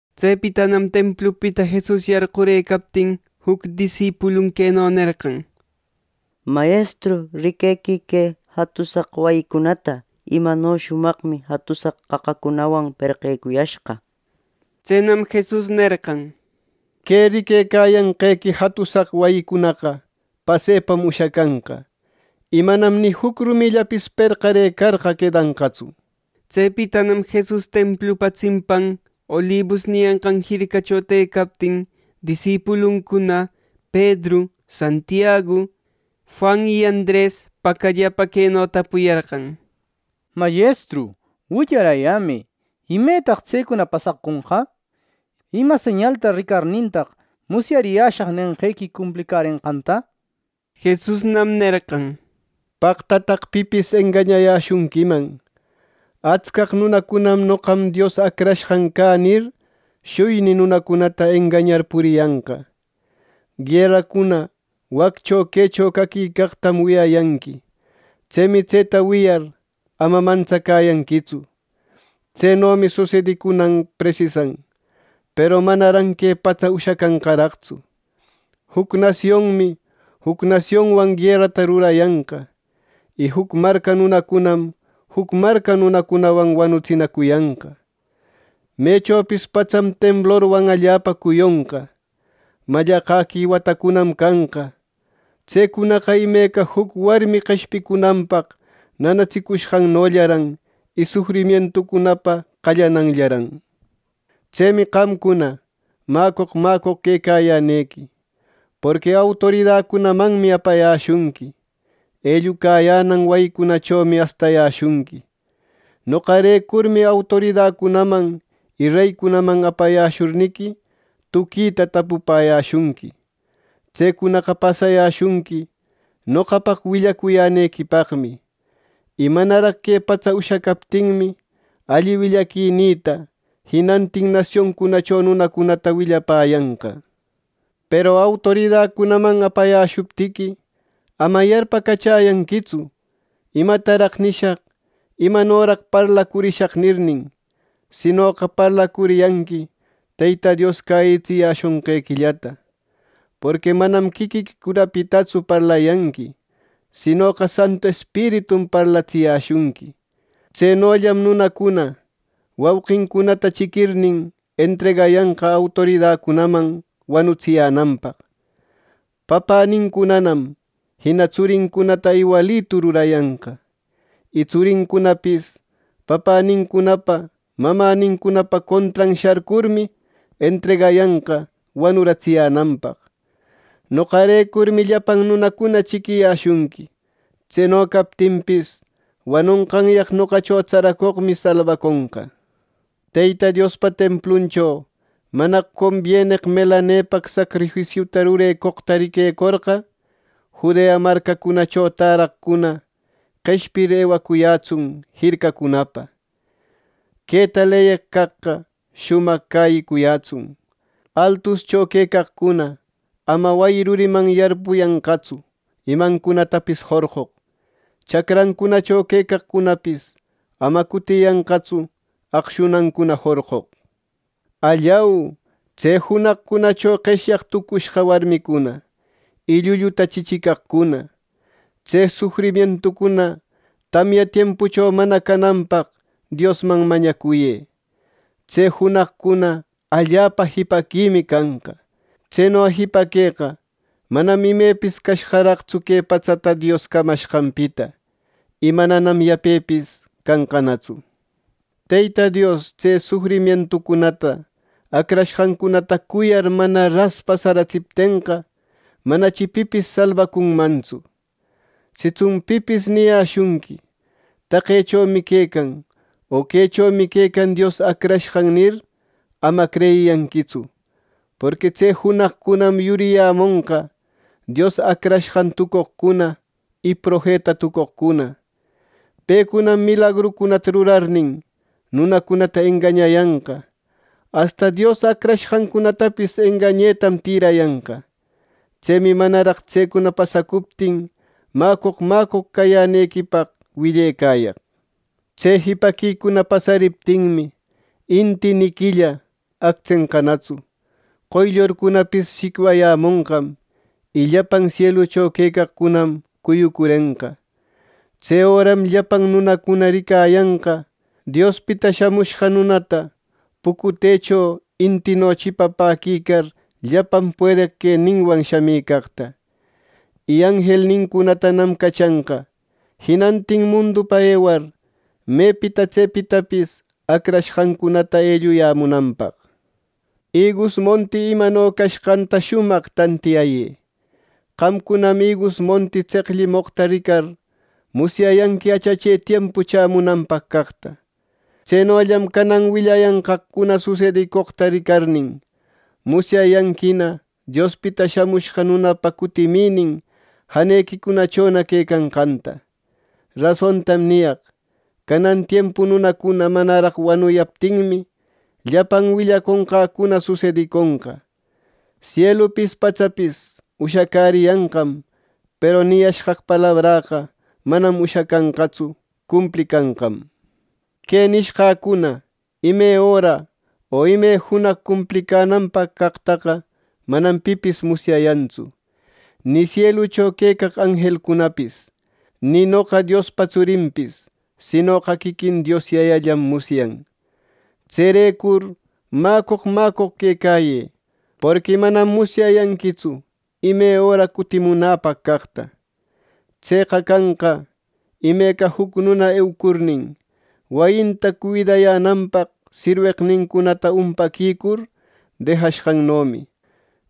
Tsepitanam templupita Jesus yarqurëcaptin juc disipulun queno nerqan: —Mayestru riquequï que jatusaq wayicunata, imano shumaqmi jatusaq qaqacunawan perqecuyashqa. Tsenam Jesus nerqan: —Que riquecayanqequi jatusaq wayicunaqa pasepam ushacanqa, y manam ni juc rumillapis perqarëcarqa quedanqatsu. Tsepitanam Jesus templupa tsimpan Olibus niyanqan jircacho tëcaptin, disipuluncuna Pedru, Santiagu, Juan y Andres pacallapa queno tapuyarqan: —Mayestru, willarayämë, ¿Imetaq tsecuna pasaconqa? ¿Ima señalta ricarnintaq musyariyäshaq nenqequi cumplicärenqanta? —nir. Jesusnam nerqan: “¡Paqtataq pipis engañayäshunquiman! Atscaq nunacunam ‘Noqam Dios Acrashqan cä’ nir, shuyni nunacunata engañar puriyanqa. Gueracuna waccho quecho caquicaqtam wiyayanqui. Tsemi tseta wiyar ama mantsacäyanquitsu. Tsenomi susedicunan presisan, peru manaran que patsa ushacanqaraqtsu. “Juc nasionmi juc nasionwan guerata rurayanqa. Y juc marca nunacunam juc marca nunacunawan wanutsinacuyanqa. Mechopis patsam temblorwan allapa cuyonqa. Mallaqäqui watacunam canqa. Tsecunaqa imeca juc warmi qeshpicunanpaq nanatsicushqannollaran y sufrimientucunapa qallananllaran. “Tsemi qamcuna mäcoq mäcoq quecayänequi; porqui autoridacunamanmi apayäshunqui. Ellucayänan wayicunachomi astayäshunqui. Noqarecurmi autoridacunaman y reycunaman apayäshurniqui, tuquita tapupäyäshunqui. Tsecunaqa pasayäshunqui noqapaq willacuyänequipaqmi. Y manaraq que patsa ushacaptinmi, alli willaquinïta jinantin nasioncunacho nunacunata willapäyanqa. Peru autoridacunaman apayäshuptiqui, ama yarpacachäyanquitsu, ‘¿Imataraq nishaq? ¿Imanoraq parlacurishaq?’ nirnin; sinoqa parlacuriyanqui Teyta Dios cäyitsiyäshonqequillata. Porqui manam quiquiquicunapitatsu parlayanqui, sinoqa Santu Espiritum parlatsiyäshunqui. Tsenollam nunacuna wauqincunata chiquirnin, entregayanqa autoridacunaman wanutsiyänanpaq. Papänincunanam jina tsurincunata iwalitu rurayanqa. Y tsurincunapis papänincunapa mamänincunapa contran sharcurmi, entregayanqa wanuratsiyänanpaq. Noqarecurmi llapan nunacuna chiquiyäshunqui. Tseno captinpis, wanonqanyaq noqacho tsaracoqmi salbaconqa. Teyta Diospa templuncho ‘mana combieneq melanepaq sacrifisiuta rurecoq’ riquecorqa, Judea marcacunacho täraqcuna qeshpir, ewacuyätsun jircacunapa. (Queta leyeq caqqa shumaq cäyicuyätsun.) Altuscho quecaqcuna ama wayi ruriman yarpuyanqatsu imancunatapis jorqoq. Chacrancunacho quecaqcunapis ama cutiyanqatsu aqshunancuna jorqoq. ¡Allau, tse junaqcunacho qeshyaq tucushqa warmicuna y llulluta chichicaqcuna! Tse sufrimientucuna tamya tiempucho mana cananpaq Diosman mañacuyë. Tse junaqcuna allapa jipaquimi canqa. Tseno jipaqueqa manam imepis cashqaraqtsu que patsata Dios camashqanpita; y mananam yapepis canqanatsu. Teyta Dios tse sufrimientucunata acrashqancunata cuyar mana ras pasaratsiptenqa, manachi pipis salbacunmantsu. “Sitsun pipis niyäshunqui ‘Taqechomi quecan, o quechomi quecan Dios Acrashqan’ nir, ama creyiyanquitsu. Porqui tse junaqcunam yuriyämonqa Dios Acrashqan tucoqcuna y profeta tucoqcuna. Pecunam milagrucunata rurarnin, nunacunata engañayanqa, asta Dios acrashqancunatapis engañetam tïrayanqa. Tsemi manaraq tsecuna pasacuptin mäcoq mäcoq cayänequipaq willecayaq. “Tse jipaquicuna pasariptinmi, inti ni quilla actsenqanatsu. Qoyllurcunapis shicwayämonqam y llapan sielucho quecaqcunam cuyucurenqa. Tse öram llapan nunacuna ricayanqa Diospita Shamushqa Nunata pucutecho intino chipapäquicar, llapan puedeq queninwan shamicaqta, y anjelnincunatam cachanqa jinantin mundupa ewar, mepita tsepitapis acrashqancunata elluyämunanpaq. “Igus monti imano cashqanta shumaq tantiyayë: Qamcunam igus monti tseqllimoqta ricar musyayanqui achache tiempu chämunanpaq caqta. Tsenollam canan willayanqaqcuna susedicoqta ricarnin, musyayanquina Diospita Shamushqa Nunapa cutiminin janequicunachona quecanqanta. Rasontam niyaq: Canan tiempu nunacuna manaraq wanuyaptinmi, llapan willaconqäcuna susediconqa. Sielupis patsapis ushacäriyanqam, peru niyashqaq palabräqa manam ushacanqatsu; cumplicanqam. “Que nishqäcuna ime öra o ime junaq cumplicänanpaq caqtaqa manam pipis musyayantsu, ni sielucho quecaq anjelcunapis, ni noqa Diospa tsurinpis, sinoqa quiquin Dios Yayallam musyan. Tserecur mäcoq mäcoq quecayë. Porqui manam musyayanquitsu ime öra cutimunäpaq caqta. Tseqa canqa imeca juc nuna eucurnin, wayinta cuidayänanpaq sirweqnincunanta umpaquicur dejapashqannomi.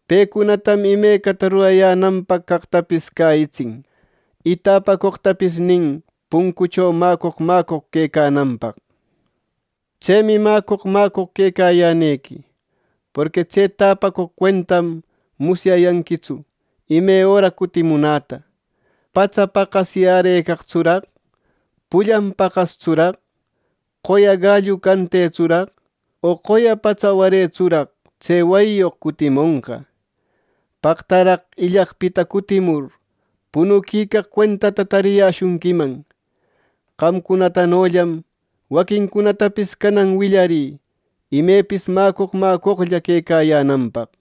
Pecunatam imecata rurayänanpaq caqtapis cäyitsin. Y täpacoqtapis nin puncucho mäcoq mäcoq quecananpaq Tsemi mäcoq mäcoq quecayänequi, porqui tse täpacoq cuentam musyayanquitsu ime öra cutimunäta. ¿Patsa paqasyärëcaqtsuraq, pullan paqastsuraq, qoya gallu cantetsuraq o qoya patsa waretsuraq tse wayiyoq cutimonqa? ¡Paqtaraq illaqpita cutimur punuquicaq cuentata tariyäshunquiman! Qamcunatanollam waquincunatapis canan willarï ¡imepis mäcoq mäcoqlla quecayänanpaq!”